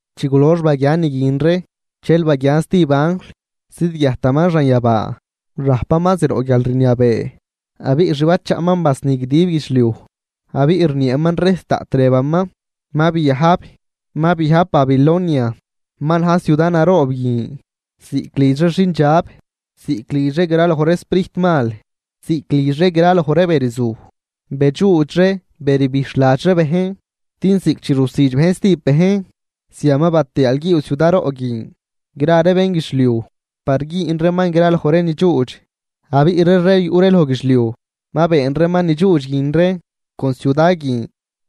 Chi gulox baguian ni guin ree, dxel baguian stijb anjl zidguiajtaman xanyabaa. Rajpaman zroꞌ guialrniabee, abiꞌ xbachaꞌman basni guidib guidxliuj, abiꞌ rnieeman rejs daꞌt rëbaman: ―Ma biajb, ma biajb Babilonia ma na̱j ciuda naroob guin ziꞌc lidx ree xindxab, ziꞌc lidx ree graloj ree sprijt mal, ziꞌc lidx ree graloj ree be ni rzuj, bedxuudx ree be rbijxhladx ree bejn. Din ziꞌc chi rusüdx bejn stijb bejn, zian ma batiaalguiiw ciudaroꞌ guin gra ree bénguidxliuj par güün reeman graloj ree ni dxuudx. Abiꞌ ree rey yuꞌ ree loj guidxliuj ma been reeman ni dxuudx guin ree con ciuda guin,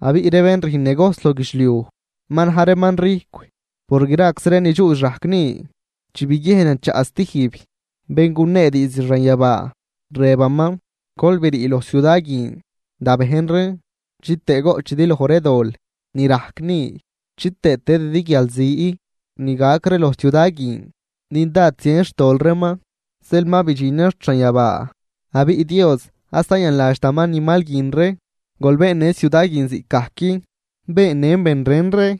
abiꞌ ree bén rüjn negojs loj guidxliuj ma na̱j reeman rijcw por graczi ree ni dxuudx rajc ni. Dxel biguiejnan chaꞌ stijb bén gunee diizd xanyabaa rëbaman: ―Gol brii loj ciuda guin, da bejn reen, chitëë goꞌchidi loj ree dol ni rajc ni chitëë tëdidi guialzi ni gac ree loj ciuda guin. Din dád zien xtol reeman zeel ma bidxinan xt xanyabaa, abiꞌ Dios ad zayanladxtaman ni mal guin ree. Gol beennë ciuda guin ziꞌcgajc beennën ben ren ree,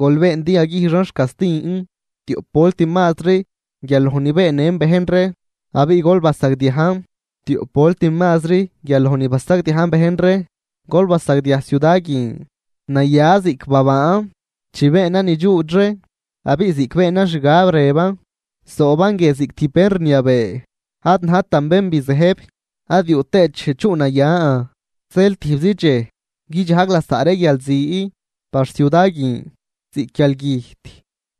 gol been din yaguijxan xcastin tioꞌp volt mazri guial loj ni beennën bejn ree abiꞌ gol basagdiajn tioꞌp volt mazri guial loj ni basagdiajn ben ren ree. Gol basagdiaj ciuda guin naya ziꞌc babaan chi beenan ni dxuudx ree, abiꞌ ziꞌc beenan xgab rëban: “Zooban guie ziꞌc tijb bén rniabee, ad najtan bén bizëjb ad yuꞌ tëët dxej chuꞌnayan.” Zeel tijbzi dxej guidxajg lasaꞌ ree guialzi par ciuda guin, ziꞌc guialgüjt,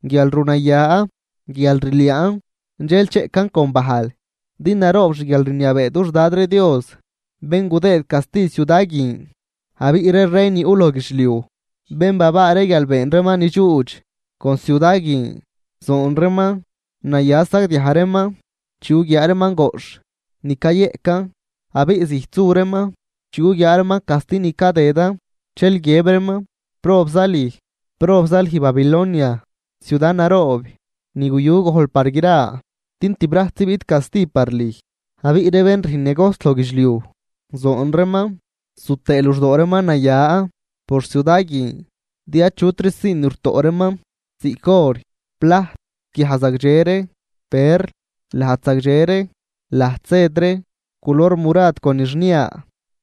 guialrunaya, guialrliaan, dxel cheꞌcan con bajl. Din naroob xguialrniabee dux Dad ree Dios bén gudëëd casti ciuda guin. Abiꞌ ree rey ni yuꞌ loj guidxliuj, bén babaa ree guial been reeman ni dxuudx con ciuda guin, zoon reeman, naya sagdiaj reeman chi guguiaa reeman goꞌxh ni cayeꞌcan. Abiꞌ zijt su reeman chi guguiaa reeman casti ni cadëdan, dxel guiëb reeman: ―¡Probza lüj, probza lüj Babilonia, ciuda naroob ni guyu gojl par gra! Din tibrajtzi biꞌt casti par lüj. Abiꞌ ree bén rüjn negojs loj guidxliuj zoon reeman zu tëë luxdoo reeman naya por ciuda guin, din achutri sii ni rutoꞌ reeman, ziꞌc or, plajt, guiaj zagdxe ree, perl, lajd zagdxe ree, lajd sed ree culor murad con ni xnia,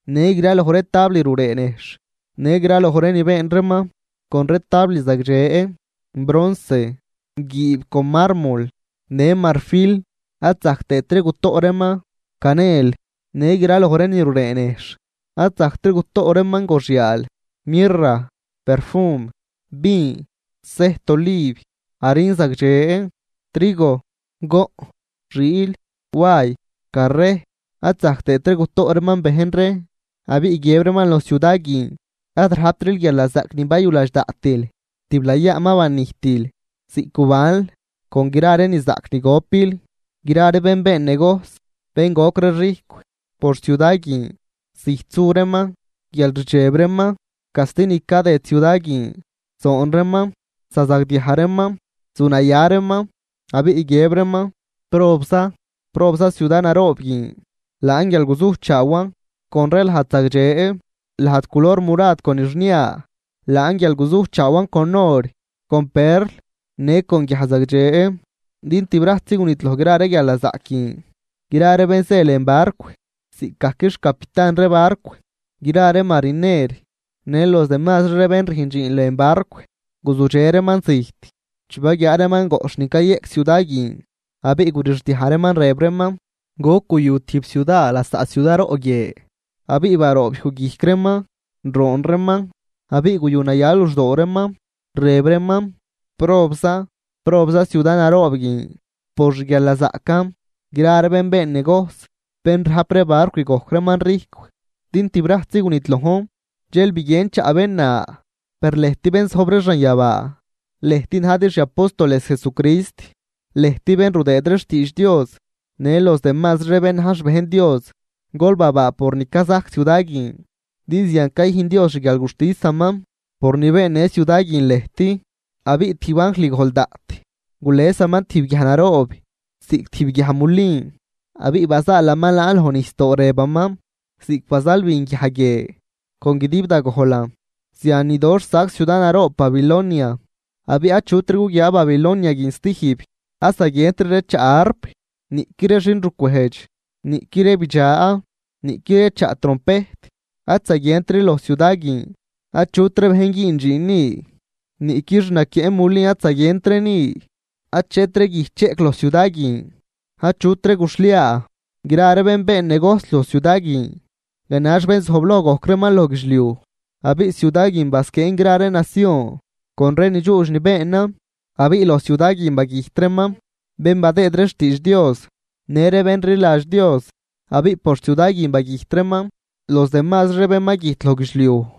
në graloj ree tabl ruree nejxh në graloj ree ni been reeman con ree tabl zagdxe, bronce, guiib con marmol në marfil. Ad zajc tëëtri gutoꞌ reeman canel në graloj ree ni ruree nejxh, ad zajctri gutoꞌ reeman goxyaal, mirra, perfum, vin, sejt oliv, harin zagdxe, trigo, goꞌn, xiil, way, carrejt, ad zajc tëëtri ree gutoꞌ reeman bejn ree. Abiꞌ guiëb reeman loj ciuda guin: ―¡Ad rajptril guialnazaꞌc ni bayuladx daꞌtil, tiblayaa ma banijtil ziꞌc gubanl con gra ree ni zaꞌc ni gopil! Gra ree bén been negojs, bén gojc ree rijcw por ciuda guin, zijt su reeman guialrdxeb reeman casti ni cadëd ciuda guin. Zoon reeman, zazagdiaj reeman, zunaya reeman. Abiꞌ guiëb reeman: ―¡Probza, probza ciuda naroob guin! Laan guial guzujchaawan con ree lajd zagdxe, lajd culor murad con ni xnia, laan guial guzujchaawan con or, con perl në con guiaj zagdxe din, ¡tibrajtzi gunidloj gra ree guialnazaꞌc guin! Gra ree bén zë lën barcw, ziꞌcgajc xcapitan ree barcw, gra ree mariner në los demazri ree bén rüjn dxiin lën barcw, guzudxe reeman zijt chi baguiaa reeman goꞌxh ni cayëꞌc ciuda guin, abiꞌ gurixdiaj reeman rëb reeman: ―¿Goc guyu tijb ciuda lasaꞌ ciuda roꞌ guie? Abiꞌ baroob yuj guijc reeman, roon reeman abiꞌ guyunaya luxdoo reeman rëb reeman: ―¡Probza!, probza ciuda naroob guin por xguialnazaꞌcan gra ree bén been negojs bén rajp ree barcw gojc reeman rijcw, din tibrajtzi gunidlojn. Dxel biguien chaꞌ bén na: ―Per lëjt bén zojb ree xanyabaa, lëjt najdi xi apóstoles Jesucrist, lëjt bén rudëëd ree xtiidx Dios në los demazri ree bén na̱j xbejn Dios, gol babaa por ni cazajc ciuda guin din zian cayüjn Dios xguialguxtisaman por ni beennë ciuda guin lëjt. Abiꞌ tijb anjl gojl daꞌt, gulesaman tijb guiaj naroob, ziꞌc tijb guiaj mulin abiꞌ bazaalaman laan loj nijsdoo rëbaman: ―Ziꞌc bazalbin guiaj guie con guidib da gojlan zian nidoxh sac ciuda naroob Babilonia, abiꞌ achutri guguiaa Babilonia guin stijb. Ad zaguientri ree chaꞌ arp, niꞌqui ree xinrucwejdx, niꞌqui ree bidxa, niꞌqui ree chaꞌ trompejt ad zaguientri loj ciuda guin. Achutri bejn güün dxiin ni, niꞌqui xnaquieꞌ mulin ad zaguientri ni. Achetri guij cheꞌc loj ciuda guin, achutri guxhliaa. Gra ree bén been negojs loj ciuda guin ganax bén zojbloj gojc reeman loj guidxliuj, abiꞌ ciuda guin basquieen gra ree nacion con ree ni dxuudx ni beenan. Abiꞌ loj ciuda guin bagüjt reeman bén badëëd ree xtiidx Dios, në ree bén rliladx Dios, abiꞌ por ciuda guin bagüjt reeman los demasri ree bén ma güjt loj guidxliuj.